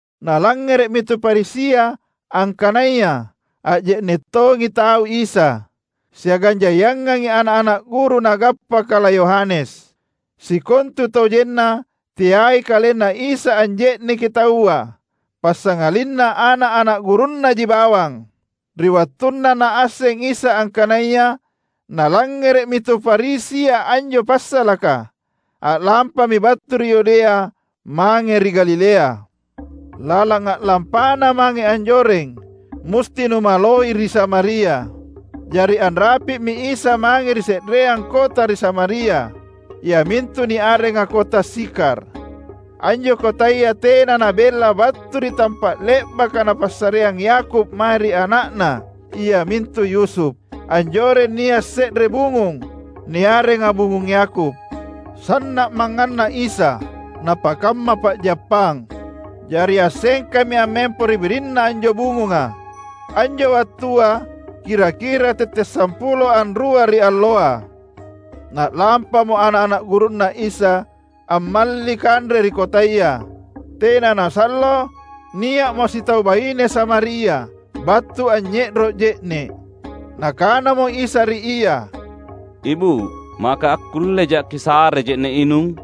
Nalangngere’mi tu Farisia angkanaya anje’ne’ tongi tau Isa, siagang jaiangangi ana’-ana’ guru nagappa kala Yohanes. (Sikontutojenna teai KalenNa Isa anje’neki tauapassangalinna ana’-ana’ gurunNaji bawang.) Ri wattunna Naasseng Isa angkanaya nalangngere’mi tu Farisia anjo passalaka, a’lampami battu ri Yudea mange ri Galilea. Lalang a’lampaNa mange anjoreng, musti numaloi ri Samaria. Jari anrapi’mi Isa mange ri se’reang kota ri Samaria, iamintu niarenga kota Sikhar. Anjo kotaya tena nabella battu ri tampa’ le’baka napassareang Yakub mae ri ana’na iamintu Yusuf. Anjoreng nia’ se’re bungung, niarenga bungung Yakub. Sanna’ mangnganna Isa napakamma pa’jappang. Jari assengkami ammempo ri birinna anjo bungunga. Anjo wattua kira-kira tette’ sampulo anrua ri alloa. Na’lampamo ana’-ana’ gurunNa Isa ammalli kanre ri kotaya. Tena nasallo, nia’mo sitau baine Samaria battu anynye’ro’ je’ne’. Nakanamo Isa ri ia, "Ibu’, maka akkullejA’ kisare je’ne’ inung?"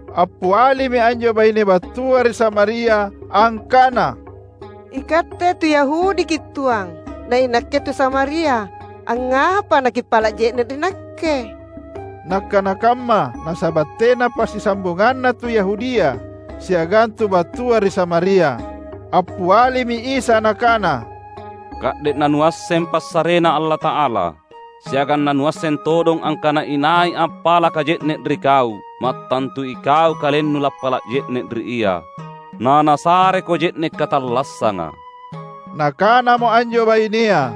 Appialimi anjo baine battua ri Samaria angkana, "IKatte tu YahudiKi’ tuang, na inakke tu Samaria; angngapa naKippala’ je’ne’ ri nakke?" (Nakkana kamma nasaba’ tena passisambunganna tu Yahudia siagang tu battua ri Samaria.) Appialimi Isa Nakana, "Ka’de’ nanuasseng passareNa Allata’ala, siagang nanuasseng todong angkana inai appalaka je’ne’ ri kau, mattantu ikau kalennu lappala’ je’ne ri Ia, na Nasareko je’ne’ katallassanga." Nakanamo anjo bainea,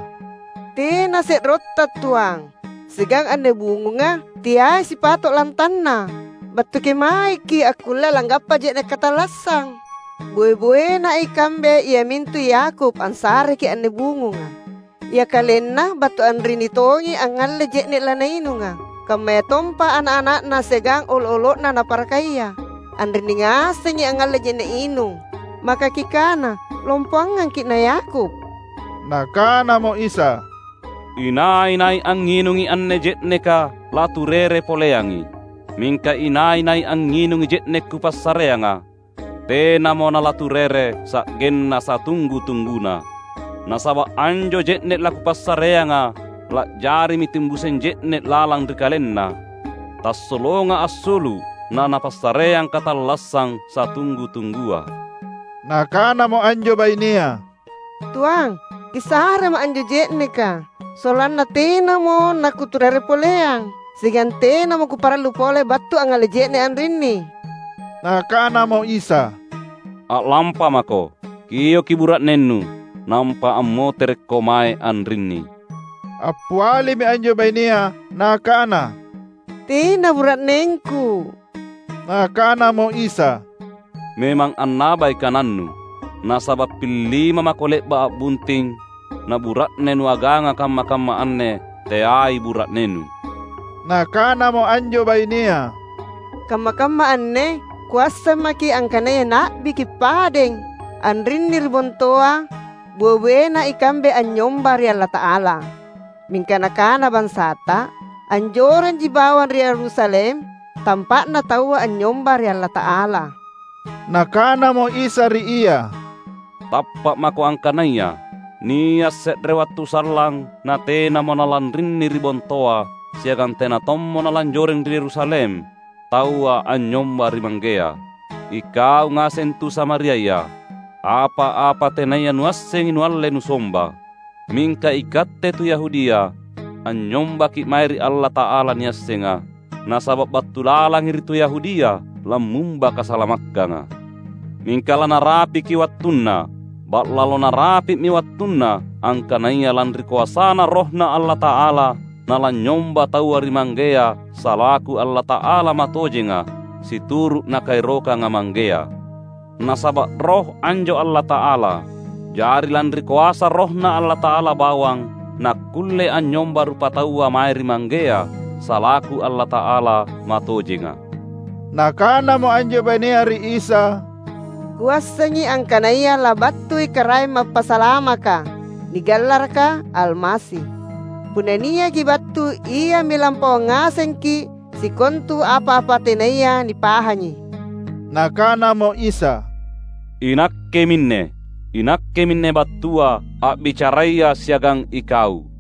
"Tena se’rotTa tuang, siagang anne bungunga teai sipato’ lantanna. Battu kemaeKi’ akkulle langgappa je’ne’ katallassang? Boe-boena ikambe iamintu Yakub ansareki’ anne bungunga. Ia kalenna, battu anrinni tongi angngalle je’ne’ lanainunga; kammayatompa ana’-ana’na siagang olo’-olo’ naparakaia, anrinni ngasengi angngalle je’ne’ inung. Maka Kikana lompoangangKi’ na Yakub?" Nakanamo Isa, "Inai-nai angnginungi anne je’neka laturere poleangi. Mingka inai-nai angnginungi je’ne’ Kupassareanga, tenamo nalaturere sa’genna satunggu-tungguna. Nasaba’ anjo je’ne’ laKupassareanga la’jarimi timbuseng je’ne’ lalang ri kalenna, tassolonga assulu’ na napassareang katallassang satunggu-tunggua." Nakanamo anjo bainea, "Tuang, Kisarema’ anjo je’neka, sollanna tenamo nakuturere poleang; siagang tenamo kuparallu pole battu angngalle je’ne’ anrinni." Nakanamo Isa, "A’lampamako, kioki bura’nennu, nampa ammoterekko mae anrinni." Appialimi anjo bainea nakana, "Tena bura’nengku." Nakanamo Isa, "Memang annabai kanannu. Nasaba’ pillima mako le’ba’ a’bunting, na bura’ne nuaganga kamma-kamma anne teai bura’nennu." Nakanamo anjo bainea, "Kamma-kamma anne kuasseng maKi’ angkanaya Na’biKi’ padeng. Anrinni ri bontoa boe-boena ikambe anynyomba ri Allata’ala, mingka nakana bansaTa anjorenji bawang ri Yerusalem tampa’na taua anynyomba ri Allata’ala." Nakanamo Isa ri ia, "Tappa’ mako angkanaya nia’ se’re wattu sallang natenamo nalanrinni ri bontoa, siagang tena tommo nalanjoreng ri Yerusalem, taua anynyomba ri Manggea. Ikau ngaseng tu Samariaya, apa-apa tenaya nuassengi nualle nusomba. Mingka ikatte tu Yahudia, anynyombaki’ mae ri Allata’ala niassenga, nasaba’ battu lalangi ri tu Yahudia lammumba kasalamakkanga. Mingka lanarapiki wattunna, ba’lalo narapi’mi wattunna, angkanaya lanri koasaNa RohNa Allata’ala nalanynyomba taua ri Manggea salaku Allata’ala matojenga situru’ Nakaerokanga Manggea. Nasaba’ Roh anjo Allata’ala, jari lanri koasa RohNa Allata’ala bawang nakkulle anynyomba rupataua mae ri Manggea salaku Allata’ala matojenga." Nakanamo anjo bainea ri Isa, "Kuassengi angkanaya labattui Karaeng Mappasalamaka (nigallaraka Almasi). Punna niaki battu, Iami lampauang ngasengki’ sikontu apa-apa tenaya nipahangi." Nakanamo Isa, "INakke minne. INakke minne battua, a’bicaraya siagang ikau."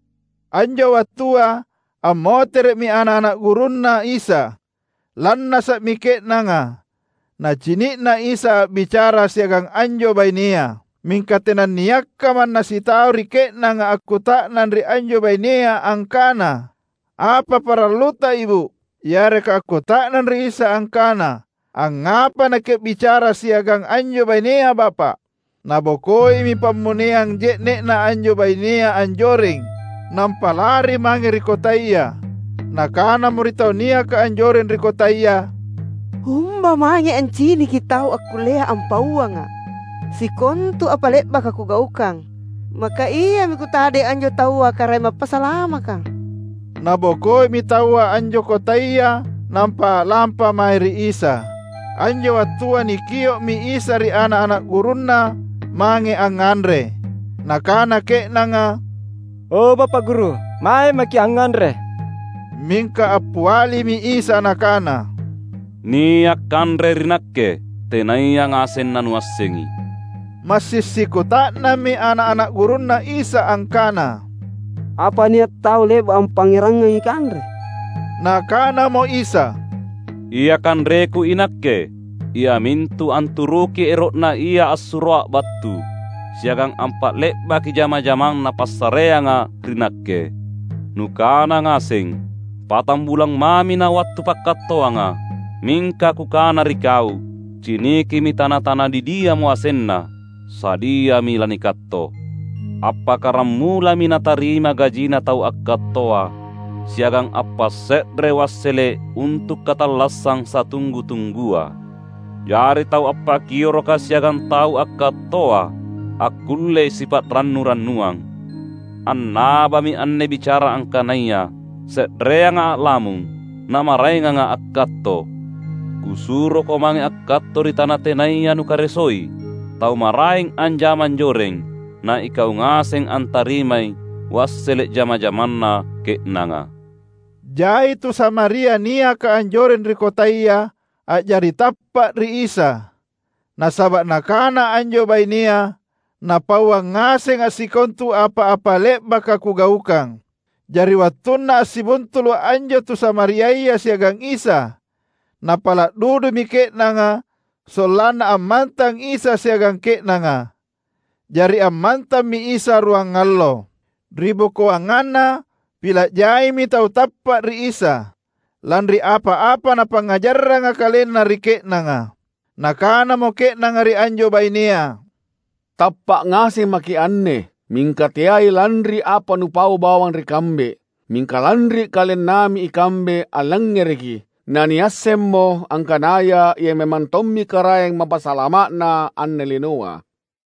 Anjo wattua ammotere’mi ana’-ana’ gurunNa Isa. Lannasa’mi ke’nanga nacini’na Isa a’bicara siagang anjo bainea. Mingka tenanniakka manna sitau ri ke’nanga akkuta’nang ri anjo bainea angkana, "Apa paralluta ibu’?" yareka akkuta’nang ri Isa angkana, "Angngapa naKi’bicara siagang anjo bainea Bapa’?" Nabokoimi pammoneang je’ne’na anjo bainea anjoreng nampa lari mange ri kotaya. Nakanamo ri tau niaka anjoreng ri kotaya, "Umba mange anciniki tau akkullea ampauanga’ sikontu apa le’baka kugaukang. Maka Iami kutadeng anjo taua Karaeng Mappasalamaka?" Nabokoimi taua anjo kotaya nampa a’lampa mae ri Isa. Anjo wattua nikio’mi Isa ri ana’-ana’ gurunNa mange angnganre. Nakana ke’nanga, "O Bapa’ Guru, mae maKi’ angnganre." Mingka appialimi Isa Nakana, "Nia’ kanre ri Nakke, tenaya ngaseng nanuassengi." Massing sikuta’nammi ana’-ana’ gurunNa Isa angkana, "Apa nia’ tau le’ba’ ampangngerangangi kanre?" Nakanamo Isa, "Ia kanreKu iNakke, iamintu anturuki ero’Na Ia assuroA’ battu, siagang ampa’le’baki jamang-jamang Napassareanga ri Nakke. Nukana ngaseng, ‘Patambulang mami nawattu pakkattoanga.’ Mingka Kukana ri kau: Cinikimi tana-tana didiamo asenna, sadiami lanikatto! Appakkaramulami natarima gajina tau akkattoa siagang appasse’re wassele’ untu’ katallassang satunggu-tunggua. Jari tau appakioroka siagang tau akkattoa akkullei sipa’rannu-rannuang. Annabami anne bicara angkanaya, ‘Se’reanga a’lamung, namaraenganga akkatto.’ Kusuroko mange akkatto ri tana tenaya nukaresoi. Tau maraeng anjama anjoreng, na ikau ngaseng antarimai wassele’ jama-jamanna ke’nanga." Jai tu Samaria niaka anjoreng ri kotaya a’jari tappa’ ri Isa. Nasaba’ nakana anjo bainea, "Napauang ngasenga’ sikontu apa-apa le’baka kugaukang." Jari wattunna assibuntulu’ anjo tu Samariaya siagang Isa, napala’ dudumi ke’nanga sollanna ammantang Isa siagang ke’nanga. Jari ammantammi Isa ruangallo. Ribokoanganna, pila’ jaimi tau tappa’ ri Isa, lanri apa-apa Napangngajarranga kalenna ri ke’nanga. Nakanamo ke’nanga ri anjo bainea, "Tappa’ ngaseng maki’ anne, mingka teai lanri apa nupaua bawang ri kambe; mingka lanri kalennami ikambe allangngereki, naniassemmo angkanaya Ia memang tommi Karaeng Mappasalama’na anne linoa."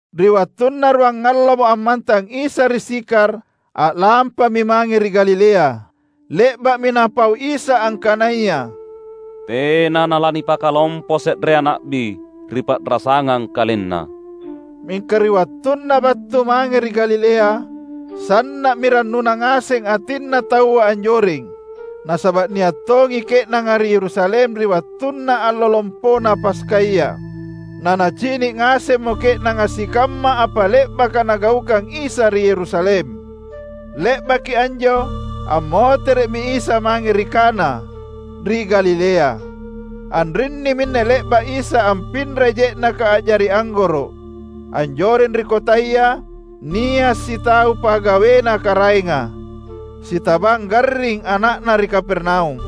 Ri wattunna ruangallomo ammantang Isa ri Sikhar, a’lampami mange ri Galilea. Le’ba’mi Napau Isa angkanaya, "Tena nalanipakalompo se’rea na’bi ri pa’rasangang kalenna." Mingka ri wattunna battu mange ri Galilea, sanna’mi rannuna ngaseng atinna taua anjoreng. Nasaba’ nia’ tongi ke’nanga ri Yerusalem ri wattunna Allo Lompona Paskaya. Nanacini’ ngasemmo ke’nanga sikamma apa le’baka Nagaukang Isa ri Yerusalem. Le’baki anjo, ammotere’mi Isa mange ri Kana, ri Galilea. Anrinni minne le’ba’ Isa ampinrai je’neka a’jari anggoro’. Anjoreng ri kotaya, nia’ sitau pagawena karaenga, sitabang garring ana’na ri Kapernaum.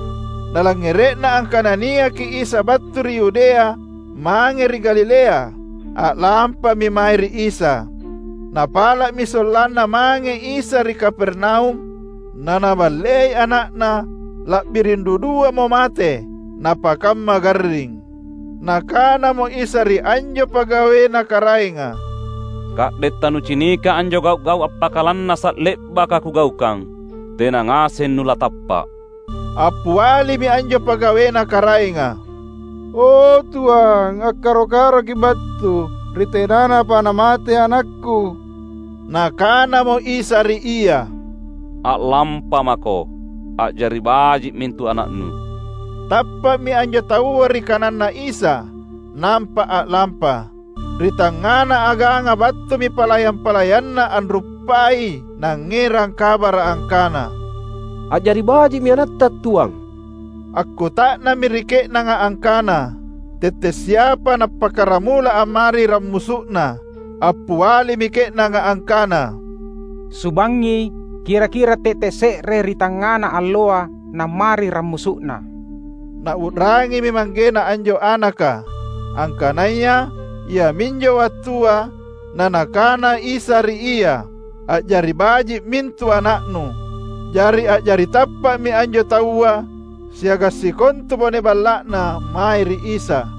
Nalangngere’na angkana niaki Isa battu ri Yudea mange ri Galilea, a’lampami mae ri Isa. Napala’mi sollanna mange Isa ri Kapernaum na Naballei ana’na la’biring duduamo mate napakamma garring. Nakanamo Isa ri anjo pagawena karaenga, "Ka’de’ tanucinika anjo gau’-gau’ appakalannasa’ le’baka Kugaukang, tena ngaseng nulatappa’." Appialimi anjo pagawena karaenga, "O, Tuang, akkaro-karoKi’ battu, ri tenanapa namate anakku." Nakanamo Isa ri ia, "A’lampamako, a’jari baji’ mintu ana’na." Tappa’mi anjo taua ri kananNa Isa, nampa a’lampa. Ri tangngana aganga battumi palayang-palayanna anruppai nangngerang kabara’ angkana, "A’jari baji’mi anatta tuang." Akkuta’nammi ri ke’nanga angkana, tette’ siapa nappakkaramula ammari rammusu’na. Appialimi ke’nanga angkana, "Subangngi, kira-kira tette’ se’re ri tangngana alloa nammari rammusu’na." Nau’rangimi manggena anjo anaka angkanaya iaminjo wattua na Nakana Isa ri ia, "A’jari baji’ mintu ana’nu." Jari a’jari tappa’mi anjo taua siagang sikontu bone balla’na, mae ri Isa.